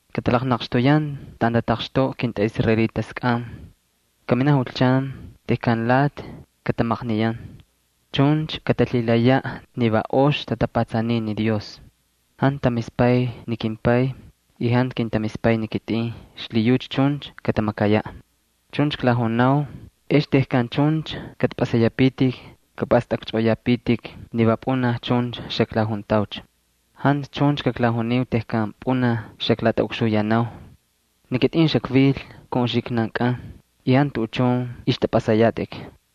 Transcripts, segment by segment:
Katalaqnaqxtuyan taꞌan tataqxtoꞌa kintꞌaꞌisraelitaskꞌan. Kaminaꞌ julchan tejkan lati katamaqniyan, chuncha katalhilayaꞌ ni va ox tatapatsaniy ni Dios. Jantu tamispay ni kimPay y jantu kintamispay ni kitꞌin, xlhiyucha chuncha katamakayaꞌ. Chuncha klajunau, ex tejkan chuncha kꞌatꞌapꞌasayapitik kapꞌastꞌakchꞌoꞌoyapitik ni va pꞌunaj chuncha xaklajuntaucha. ’Jantu chuncha kaklajuniu tejkan pꞌunaj xaklatꞌaꞌukxuyanau. Ni kitꞌin xakvil kun uxiknankꞌan y jantu tuꞌuchun ixtꞌapꞌasayatꞌik.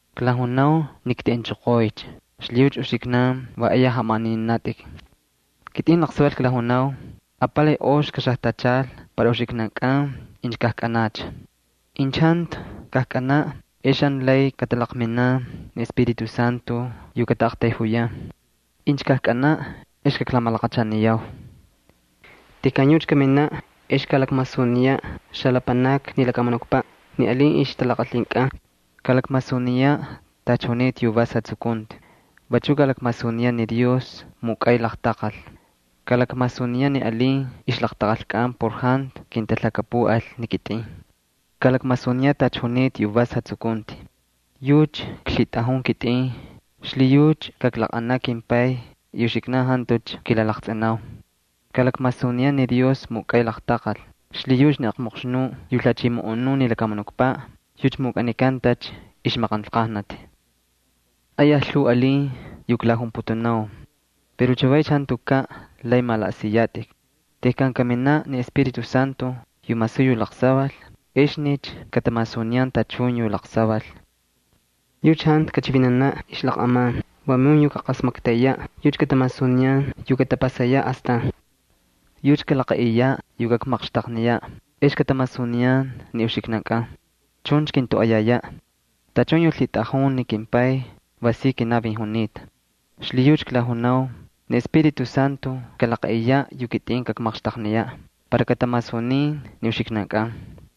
Klajunau ni kteꞌenchoqoycha, xlhiyucha uxiknan va ayaj jamaꞌanininatꞌik. Kitꞌin laqsaval klajunau, apalay ox kaxajtachal para uxiknankꞌan incha kajkꞌalcha. Incha jantu kajkꞌanaꞌ ex jantu lay katalaqminan ni Espíritu Santo yu kataꞌaqtayjuyan. Incha kajkꞌanaꞌ ex kaklamalaqachaniyau. Tejkan yucha kaminaꞌ ex kalakmasuniyaꞌ xalapanakni lakamunukpaꞌ ni alin ixtalaqalhinkꞌan, kalakmasuniyaꞌ tacha junita yu vas jatsukunti, vachuꞌ kalakmasuniyaꞌ ni Dios mukꞌay laqtaqal. Kalakmasuniyaꞌ ni alin ixtalaqalhinkꞌan por jantu kintalhakapuꞌal ni kitꞌin. Kalakmasuniyaꞌ tacha junita yu vas jatsukunti. Yucha klhitꞌajun kitꞌin xlhiyucha kaklaqꞌanaꞌ kimPay y uxiknan jantucha kilalaqtsꞌinau. Kalakmasuniyaꞌ ni Dios mukꞌay laqtaqal, xlhiyucha ni aqmoqxnuꞌ yu lhachimoꞌonun ni lakamunukpaꞌ yucha mukꞌanikantacha ixmaqanlqajnati. ’Ayaj lhuu alin yu klajunputunau pero chavaycha jantukaꞌ lay malaꞌasiyatꞌik. Tejkan kaminaꞌ ni Espíritu Santo yu masuy yu laqsaval, exnicha katamasuniyan tachun yu laqsaval. Yucha jantu kachivinanaꞌ ixlaqꞌaman, vamun yu kaqasmaktayaꞌ. Yucha katamasuniyan yu katapasayaꞌ astan. Yucha kalaqaꞌiyaꞌ yu kakmaqxtaqniyaꞌ ex katamasuniyan ni uxiknankꞌan, chuncha kintoꞌoyayaꞌ. Tachun yu lhitꞌajun ni kimPay va si kinavin junita. Xlhiyucha klajunau ni Espíritu Santo kalaqaꞌiyaꞌ ni chivinti yu kitꞌin kakmaqxtaqniyaꞌ para katamasunin ni uxiknankꞌan.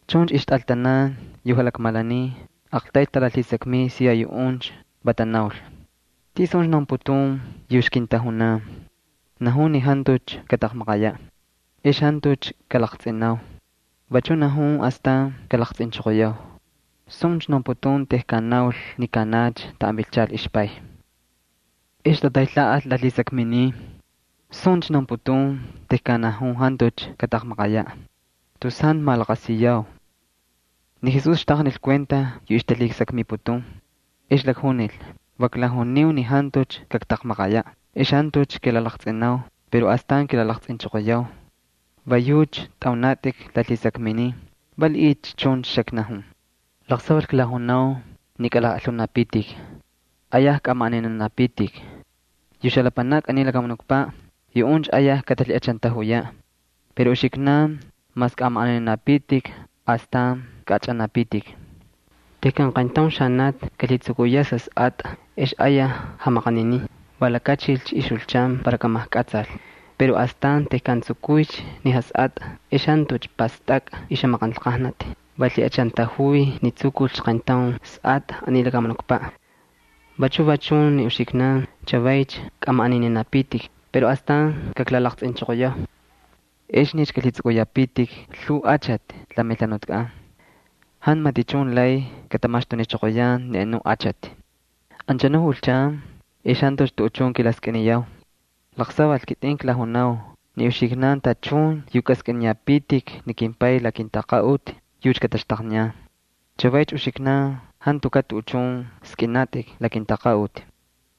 Chuncha ixtꞌaltanan yu jalakmalaniy aqtayl talalhisakmiy siya yuꞌuncha, va tanaul: —¿Tisuncha naunputun yu ixkintajunan? Najun ni jantucha kataqmaqayaꞌ ex jantucha kalaqtsꞌinau. Vachu najun astan kalaqtsꞌinchoqoyau. ¿Suncha naunputun tejkan naul ni kaꞌanacha taꞌan vilchal ixPay? Ex tataylhaꞌal lalhisakminin: —¿Suncha naunputun tejkan najun jantucha kataqmaqayaꞌ? Tus jantu malaqasiyau. Ni Jesús xtaqnil kuenta yu ixtalhisakmiputun. Ex lakjunil: —Va klajuniu ni jantucha kaktaqmaqayaꞌ ex jantucha kilalaqtsꞌinau pero astan kilalaqtsꞌinchoqoyau. ¿Va yucha tꞌaunatꞌik lalhisakminin, valiꞌiycha chuncha xaknajun? Laqsaval klajunau ni kꞌalajꞌalhunapitik, ayaj kꞌamaꞌaninanapitik. Yu xalapanakni aniy lakamunukpaꞌ, yuꞌuncha ayaj katalhiꞌachantajuyaꞌ. Pero uxiknan mas kꞌamaꞌaninanapitik, astan kaꞌachꞌanapitik. Tejkan qayntaun xanati kalhitsukuyaꞌ sasꞌatꞌa ex ayaj jamaqaninin, va lakachilcha ixjulchan para kamajkꞌatsal. Pero astan tejkan tsukuycha ni jasꞌatꞌa ex jantucha pastakꞌa ixjamaqanlqajnati. Va lhiꞌachantajuy ni tsukulcha qayntaun jasꞌatꞌa aniy lakamunukpaꞌ. Vachu va chun ni uxiknan chavaycha kꞌamaꞌaninanapitik pero astan kaklalaqtsꞌinchoqoyau. Exnicha kꞌalhitsꞌukꞌuyapitik lhuu achati la melhanutkꞌan. Jantu matichun lay katamaxtunichoqoyan ni anuꞌ achati. ’Anchanu julchan ex jantucha tuꞌuchun kilalhisakmiyau. Laqsaval kitꞌin klajunau ni uxiknan tachun yu kꞌaskꞌiniyapitik ni kimPay la kintaqaꞌuti yucha kataxtaqniyan. Chavaycha uxiknan jantukaꞌ tuꞌuchun skꞌinatꞌik la kintaqaꞌuti.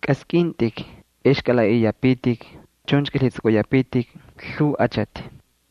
Kaskꞌintꞌik ex kꞌalaꞌaꞌiyapitik, chuncha kꞌalhitsꞌukꞌuyapitik lhuu achati.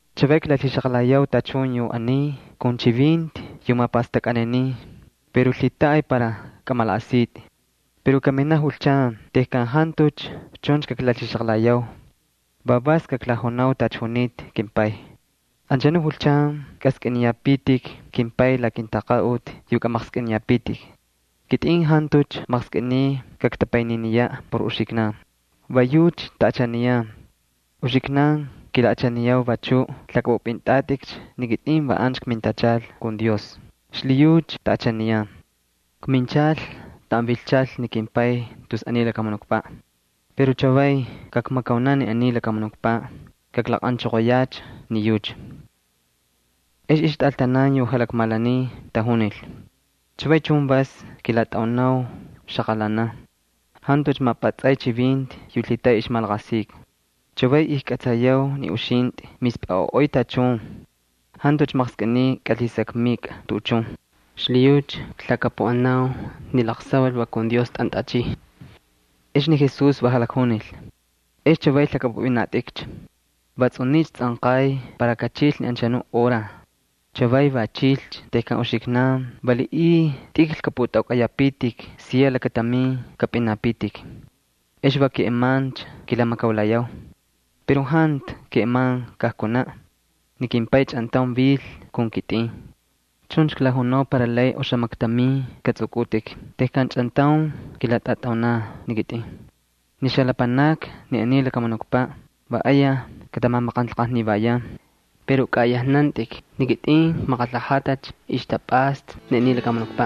’Chavay klalhixaqalayau tachun yu aniy kun chivinti yu tamapastakniyan pero lhitaꞌay para kamalaꞌasitꞌik. Pero kaminaꞌ julchan tejkan jantucha chuncha kaklalhixaqalayau, va vas kaklajunau tacha junita kimPay. Anchanu julchan kꞌaskꞌiniyapitik kimPay la kintaqaꞌuti yu kꞌamaqskꞌiniyapitik. Kitꞌin jantucha maqskꞌiniy kaktapayniniyaꞌ por uxiknankꞌan, va yucha taꞌachaniyan. Uxiknan kilaꞌachaniyau vachu lhakꞌapꞌupꞌintꞌatꞌikcha ni kitꞌin va ancha kmintachal kun Dios, xlhiyucha taꞌachaniyan. Kminchal taꞌan vilchal ni kimPay tus aniy lakamunukpaꞌ. Pero chavay kakmakaunaꞌ ni aniy lakamunukpaꞌ, kaklaqꞌanchoqoyacha ni yucha. Ex ixtꞌaltanan yu jalakmalaniy tajunil: —Chavay chun vas kilatꞌaunau xaqalanan, jantucha mapꞌatsꞌay chivinti yu lhitaꞌay ixmalaqasika. Chavay ijkꞌatsayau ni uxintꞌi mispꞌaꞌoꞌoy tachun, jantucha maqskꞌiniy kꞌalhisakmikꞌa tuꞌuchun. Xlhiyucha klhakapuꞌanau ni laqsaval va kun Dios tꞌantꞌachiy. Ex ni Jesús va jalakjunil: —¿Ex chavay lhakꞌapꞌupꞌinatꞌikcha? Va tsꞌuniycha tsꞌanqay para kachil ni anchanu hora, chavaycha va chilcha tejkan uxiknan valiꞌiy tꞌikl kꞌapꞌutꞌaukꞌayapitik, siya lakatamin kapꞌinapitik. Ex va keꞌemancha kilamakaulayau. Pero jantu keꞌeman kaktaulaꞌ, ni kimPay chꞌantaun vil kun kitꞌin. Chuncha klajunau para lay oxamaktamin katsꞌukꞌutꞌik tejkan chꞌantaun kilatꞌatꞌaunau ni kitꞌin. Ni xalapanakni ni aniy lakamunukpaꞌ va ayaj katamamaqanlqajnivayan. Pero kꞌaꞌayajnantꞌik, ni kitꞌin kmaqalhajatacha ixtapꞌasta ni aniy lakamunukpaꞌ.